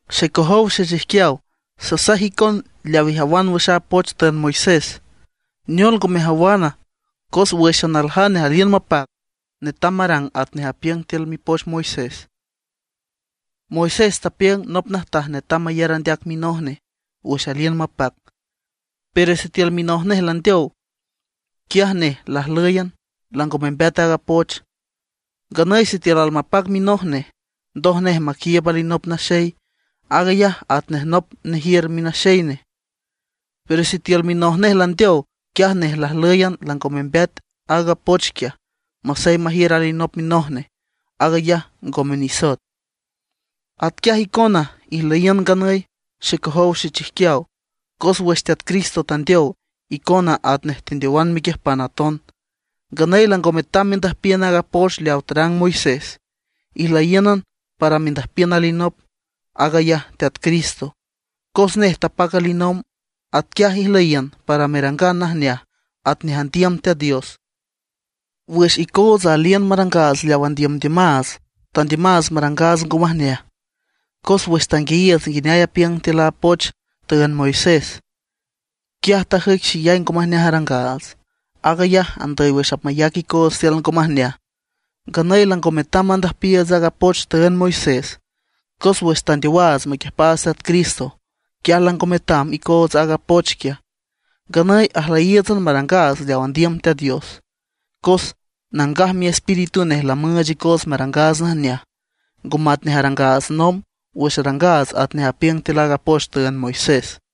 Xecojow xechijquiaw, sasaj icon leaw ijawan wüx a poch tüünd Moisés. ¿Neol ngo mejawana? Cos wǘxan aljane aliün mapac netam marang atnej apiüng tiül mipoch Moisés. Moisés tapiüng nop najtaj netam mayar andeac minoj nej wüx aliün mapac. Pero sitiül minoj nej landeow, quiaj nej lajlǘyan, lango membeat aaga poch. Nganüy sitiül almapac minoj nej, ndoj nej maquiiüb alinop naxey, aag ayaj atnej nop nejiür minaxey nej. Pero sitiül minoj nej landeow, quiaj nej lajlǘyan lango membeat aaga poch quiaj, masey majiür alinop minoj nej, aag ayaj ngome nisoet. Atquiaj icona ijlüyiün nganüy, xecojow xechijquiaw, cos wüx Teat Cristo tandeow, icona atnej tendeowan mequiüjpan aton. Nganüy lango metam mendüjpiün aaga poch leaw tarang Moisés; ijlüyiǘnan para mendüjpiün alinop, aag ayaj Teat Cristo, cos nej tapac alinomb. Atquiaj ijlüyiün para merangan najneaj atnej andiüm Teat Dios. Wüx icootsa aliün marangaats leaw andiümdiümaats, tandiümaats marangaats ngo majneaj, cos wüx tanguiayiiüts nguineay apiüng tiül a poch tüünd Moisés, quiaj tajüic xeyay ngo majneaj arangaats, aag ayaj andüy wüx apmayac icoots tiül ngo majneaj. Nganüy lango metam mandüjpiiüts aaga poch tüünd Moisés, cos wüx tandeowaats maquiüjpaats Teat Cristo, quiaj lango metam icoots aaga poch quiaj. Nganüy ajlüyíiütsan marangaats leaw andiüm Teat Dios. Cos Nangaj Miespíritu nej lamüüch icoots marangaats najneaj, ngo matnej arangaats nomb, wüx arangaats atnej apiüng tiül aaga poch tüünd Moisés.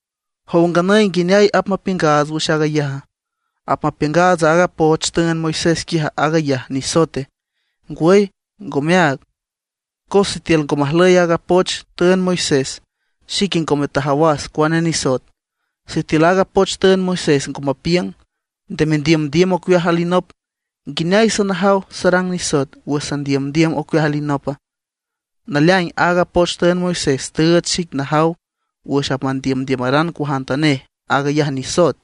¿Jow nganüy nguineay apmapiüngaats wüx aag ayaja? ¿Apmapiüngaats aaga poch tüünd Moisés quiaj, aag ayaj nisoete? ¡Ngwüy, ngome áag! Cos sitiül ngo majlüy aaga poch tüünd Moisés, xique ngome tajawas cuane nisoet. Sitiül aaga poch tüünd Moisés ngo mapiüng: “Nde mendiümdiüm ocueaj alinop”, ¿nguineay sanajaw sarang nisoet wüx sandiümdiüm ocueaj alinopa? Naleaing aaga poch tüünd Moisés tüüch xic najaw wüx apmandiümdiümaran cuajantanej, aag ayaj nisoet,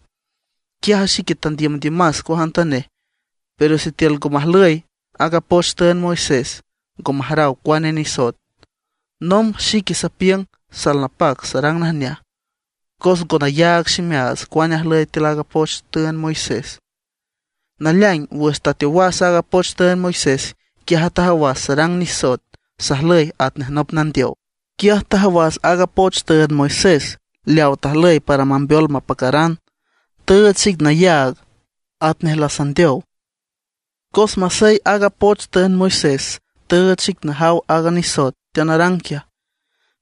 quiaj xique tandiümdiümas cuajantanej. Pero sitiül ngo majlüy a poch tüünd Moisés ngo majaraw cuane nisoet. Nomb xique sapiüng salnapac sarang najneaj, cos ngo nayaag ximeaats cuane ajlüy tiül aaga poch tüünd Moisés. Naleaing wüx tateowas aaga poch tüünd Moisés, quiaj tajawas sarang nisoet, sajlüy atnej nop nandeow. Quiaj tajawas aaga poch tüünd Moisés leaw tajlüy para mambeol mapacaran, tüüch xic nayaag atnej lasandeow. Cos masey aaga poch tüünd Moisés tüüch xic najaw aaga nisoet teanarang quiaj,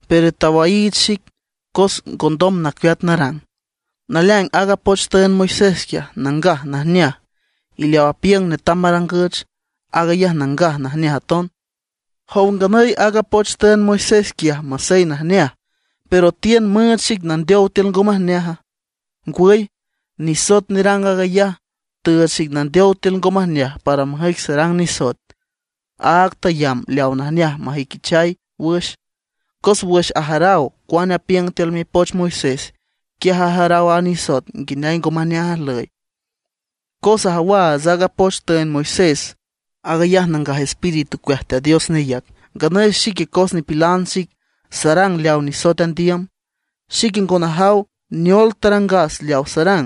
pero tawaiich xic, cos ngondom nacueat narang. Naleaing aaga poch tüünd Moisés quiaj, nangaj najneaj; y leaw apiüng netam marangüch, aag ayaj nangaj najneaj aton. ¿Jow nganüy, aaga poch tüünd Moisés quiaj masey najneaj, pero tiün müüch xic nandeow tiül ngo majneaja? ¡Ngwüy! Nisoet nerang aag ayaj, tüüch xic nandeow tiül ngo majneaj para majüic sarang nisoet, aag tayamb leaw najneaj mejüiquichay wüx. Cos wüx ajaraw cuane apiüng tiül mipoch Moisés, quiaj ajaraw a nisoet nguineay ngo majneaj ajlüy. Cos ajawaats aaga poch tüünd Moisés, aag ayaj Nangaj Espíritu ocueaj Teat Dios neyac. Nganüy xique cos nipilan xic, sarang leaw nisoet andiüm. Xique ngo najaw neol tarangas leawa sarang,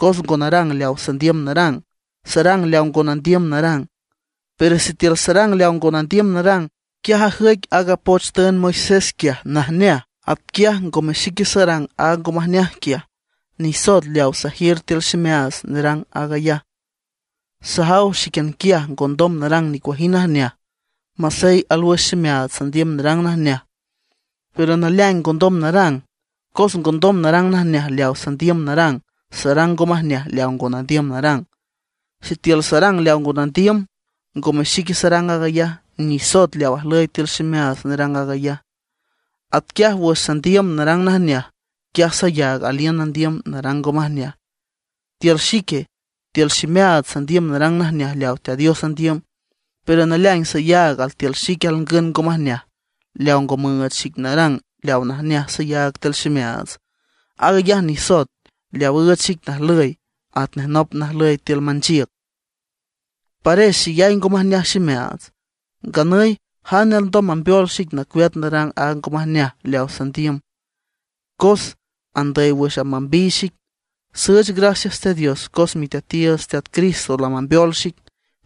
cos ngo narang leawa sandiüm narang, sarang leawa ngo nandiüm narang. Pero sitiül sarang leawa ngo nandiüm narang, quiaj ajüic aaga poch tüünd Moisés quiaj najneaj. Atquiaj ngome xique sarang aaga ngo majneaj quiaj, nisoet leaw sajiür tiül ximeaats nerang aag ayaj. Sajaw xíquian quiaj ngondom narang nicuajind najneaj, masey alwüx ximeaats sandiüm narang najneaj, pero naleaing ngondom narang. Cos ngondom narang najneaj leaw sandiüm narang, sarang ngo majneaj leaw ngo nandiüm narang. Sitiül sarang leaw ngo nandiüm, ngome xique sarang aag ayaj, nisoet leaw ajlüy tiül ximeaats nerang aag ayaj. Atquiaj wüx sandiüm narang najneaj, quiaj sayaag aliün nandiüm narang ngo majneaj. Tiül xique, tiül ximeaats sandiüm narang najneaj leaw Teat Dios andiüm. Pero naleaing sayaag altiül xique alngün ngo majneaj leaw ngo müüch xic narang leaw najneaj sayaag tiül ximeaats. Aag ayaj nisoet leaw üüch xic najlüy atnej nop najlüy tiül manchiüc. ¡Pares xeyay ngo majneaj ximeaats! ¿Nganüy jane alndom mambeol xic nacueat narang aaga ngo majneaj leaw sandiüm? Cos andüy wüx apmambiy xic. Süüch gracias Teat Dios, cos Miteatiiüts Teat Cristo lamambeol xic.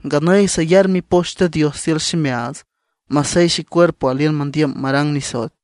Nganüy sayar Mipoch Teat Dios tiül ximeaats, masey xecuerpo aliün mandiüm marang nisoet.